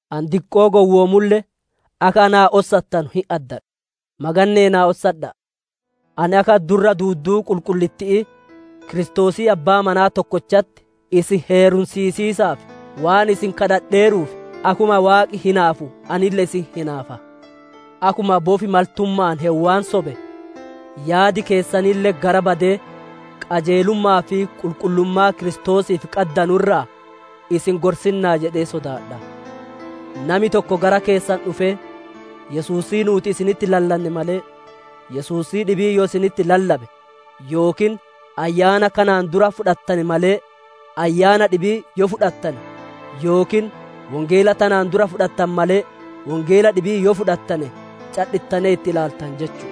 Ani diqqoo gowwoomulle akka naa ossattanu hin addadha; maganne'ee na ossadha'a. Ani akka durra duudduu qulqullitti'ii Kiristoosii abbaa manaa tokkochatti, isin heerumsiisiisaaf waan isin kadhadheeruuf, akkuma Waaqi hinaafu anille isin hinaafa. Akkuma bofi maltumma'aan Heewwan sobe, yaadi keessanille gara badee qajeelumma'aa fi qulqullummaa Kiristoosiif qaddanu irraa isin milissinaa laati jedhee sodaadha. Nami tokko gara keessan dhufee, Yesuusii nuuti isinitti lallanne malee, Yesuusii dhibii yoo isinitti lallabe yookiin ayyaana kanaan dura fudhattane malee, ayyaana dhibii yoo fudhattane yookiin Wongeela tanaan dura fudhattane malee, Wongeela dhibii yoo fudhattane, cadhittanee itti ilaaltan jechu'u.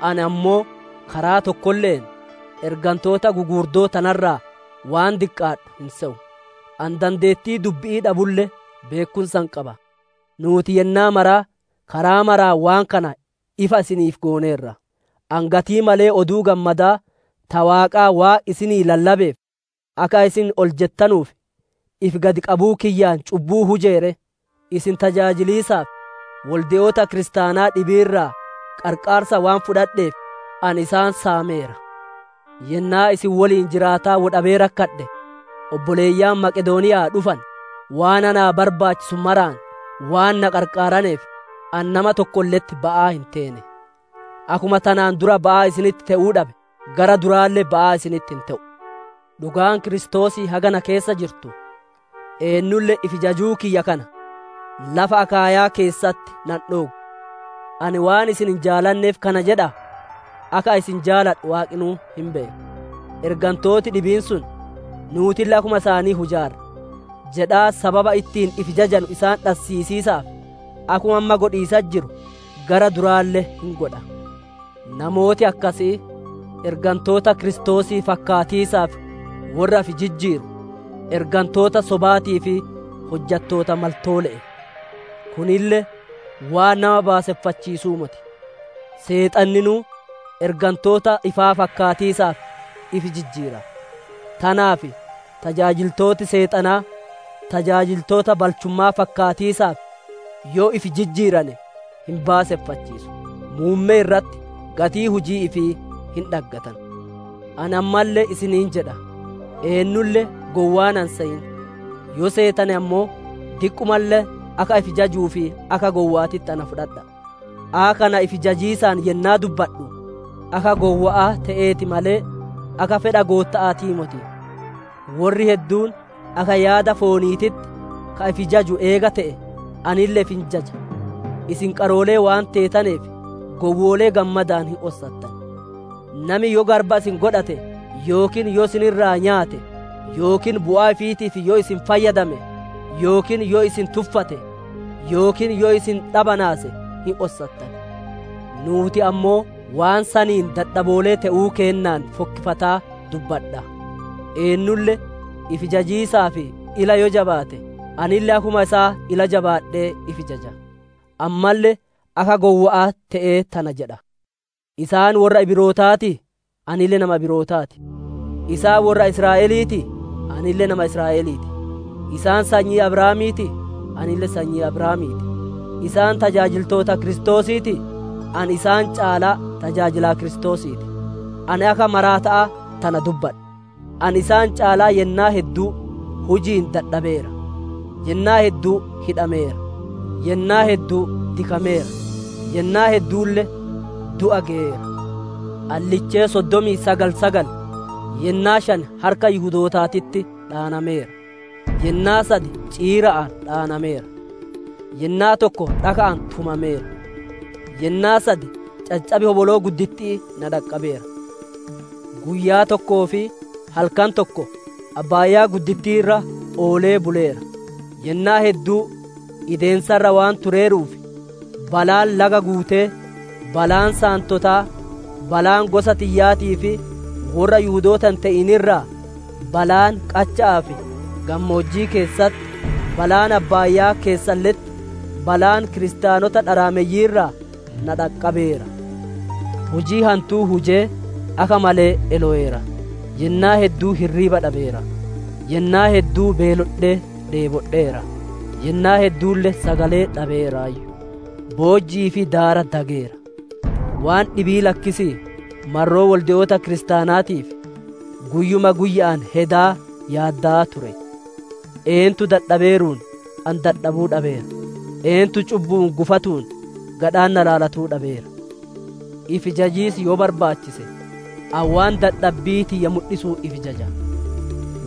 Ani ammoo karaa tokkolle'een ergantoota guguurddoo tana irraa waan diqqaadhu hin seyu. Ani dandeettii dubbi'ii dhabulle, beekkumsa hin qaba; nuuti yennaa maraa karaa maraan waan kana ifa isiniif gooneerra. Ani gatii malee Oduu Gammadaa ta Waaqaa waan isinii lallabeef, akka isin ol jettanuuf ifi gad qabuu kiyyaan cubbuu hujee ree? Isin tajaajiliisaaf, wolde'oota kiristaanaa dhibii irraa qarqaarsa waan fudhadheef, ani isaan saameera. Yennaa isin woliin jiraataa woy dhabee rakkadhe, obboleeyyan Maqedooniya'aa dhufane waan naa barbaachisu maraan waan na qaraqaaraneef, ani nama tokkolle'etti ba'aa hin teene. Akkuma tanaan dura ba'aa isinitti te'uu dhabe, gara duraalle ba'aa isinitti hin te'u. Dhugaan Kiristoosii haga na keessa jirtu, eennulle ifi jajuu kiyya kana lafa Akaayya'aa keessatti na hin dhooggu. Ani waan isin hin jaalanneef kana jedhaa? Akka ani isin jaaladhu Waaqinuu hin beeka. Ergantooti dhibiin sun, «Nuutille akkuma isaanii hujaarra» jedhaa sababa ittiin ifi jajanu isaan dhassiisiisaaf, akkuma amma godhiisatti jiru gara duraalle hin godha. Namooti akkasii ergantoota Kiristoosii fakkaatiisaaf worra ifi jijjiiru, ergantoota sobaatii fi hojjattoota maltoole'e. Kunille waan nama baaseffachiisuu moti; Seexanninuu ergantoota ifaa fakkaatiisaaf ifi jijjiira. Tanaaf tajaajiltooti Seexanaa tajaajiltoota balchumma'aa fakkaatiisaaf yoo ifi jijjiirane hin baaseffachiisu. Muummee irratti gatii hujii ifii hin dhaggatan. Ani ammalle isiniin jedha; eennulle gowwaa na hin seyin; yoo seetane ammoo diqqumalle akka ifi jajuuf akka gowwa'aatitti na fudhadha'a. Akka kana ifi jajiisaan yennaa dubbadhu akka gowwa'aa te'eeti malee, akka fedha Gootta'aatii moti. Worri hedduun akka yaada fooniititti ka ifi jaju eega te'e, anille ifi hin jaja. Isin qaroolee waan teetaneef, gowwoolee gammadaan hin ossattan. Nami yoo garba isin godhate yookiin yoo isin irra nyaate yookiin bu'aa ifiitiif yoo isin fayyadame yookiin yoo isin tuffate yookiin yoo isin dhabanaase hin ossattan. Nuuti ammoo waan saniin dadhaboolee te'uu kennaan fokkifataa dubbadha. Eennulle ifi jajiisaaf ila yoo jabaate, anille akkuma isaa ila jabaadhee ifi jaja. Ammalle akka gowwa'aa te'ee tana jedha. Isaan worra Ibirootaatii? Anille nama Ibirootaa ti. Isaan worra Israa'eliitii? Anille nama Israa'elii ti. Isaan sanyii Abrahaamiitii? Anille sanyii Abrahaamii ti. Isaan tajaajiltoota Kiristoosiitii? Ani isaan caalaa tajaajilaa Kiristoosii ti. Ani akka maraata'aa tana dubbadha; ani isaan caalaa yennaa hedduu huji'iin dadhabeera, yennaa hedduu hidhameera, yennaa hedduu dikameera, yennaa hedduulle du'a geyeera. Ani lichee soddomii sagal sagal yennaa shan harka Yihudootaatitti dhaanameera. Yennaa sad ciira'aan dhaanameera; yennaa tokko dhaka'aan tumameera; yennaa sad caccab hoboloo gudditti'ii na dhaqqabeera; guyyaa tokkoo fi halkan tokko galaana irra oolee buleera. Yennaa hedduu ideensa irra waan tureeruuf, balaan laga guutee, balaan saantotaa, balaan gosa tiyyaatii fi worra Yihudoota hin te'in irraa, balaan qacha'aa fi gammoojjii keessatti, balaan abbaayaa keessalle'etti, balaan kiristaanota dharaameyyii irraa na dhaqqabeera. Hujii hantuu hujee, akka malee eloweera; yennaa hedduu hirriiba dhabeera; yennaa hedduu beelodhee dheebbodheera; yennaa hedduulle sagalee dhabeeraayyu; boojji'ii fi daara dageera. Waan dhibii lakkisii marroo wolde'oota kiristaanaatiif, guyyuma guyya'aan hedaa yaaddowaa ture. Eentu dadhabeeruun, ani dadhabuu dhabeera? Eentu cubbu'uun gufatuun, gadhaan na laalatuu dhabeera? Ifi jajiis yoo barbaachise, ani waan dadhabbii tiyya mudhisuun ifi jaja.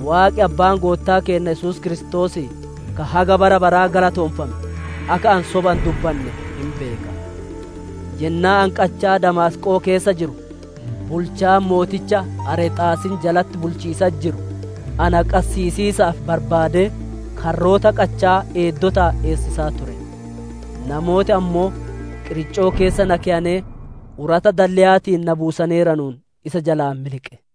Waaqi, Abbaan Goottaa kenna Yesuus Kiristoosii, ka haga bara baraa galateeffame, akka ani sobaa hin dubbanne hin beeka. Yennaa ani qachaa Damaasqo'oo keessa jiru, bulchaan mooticha Areexaasiin jalatti bulchiisatti jiru, na qassiisiisaaf barbaadee, karroota qacha'aa eeddotaan eessisaa ture. Namooti ammoo, qiriccoo keessa na keyanee urata dalleyaatiin na buusaneeranuun isa jalaa miliqe.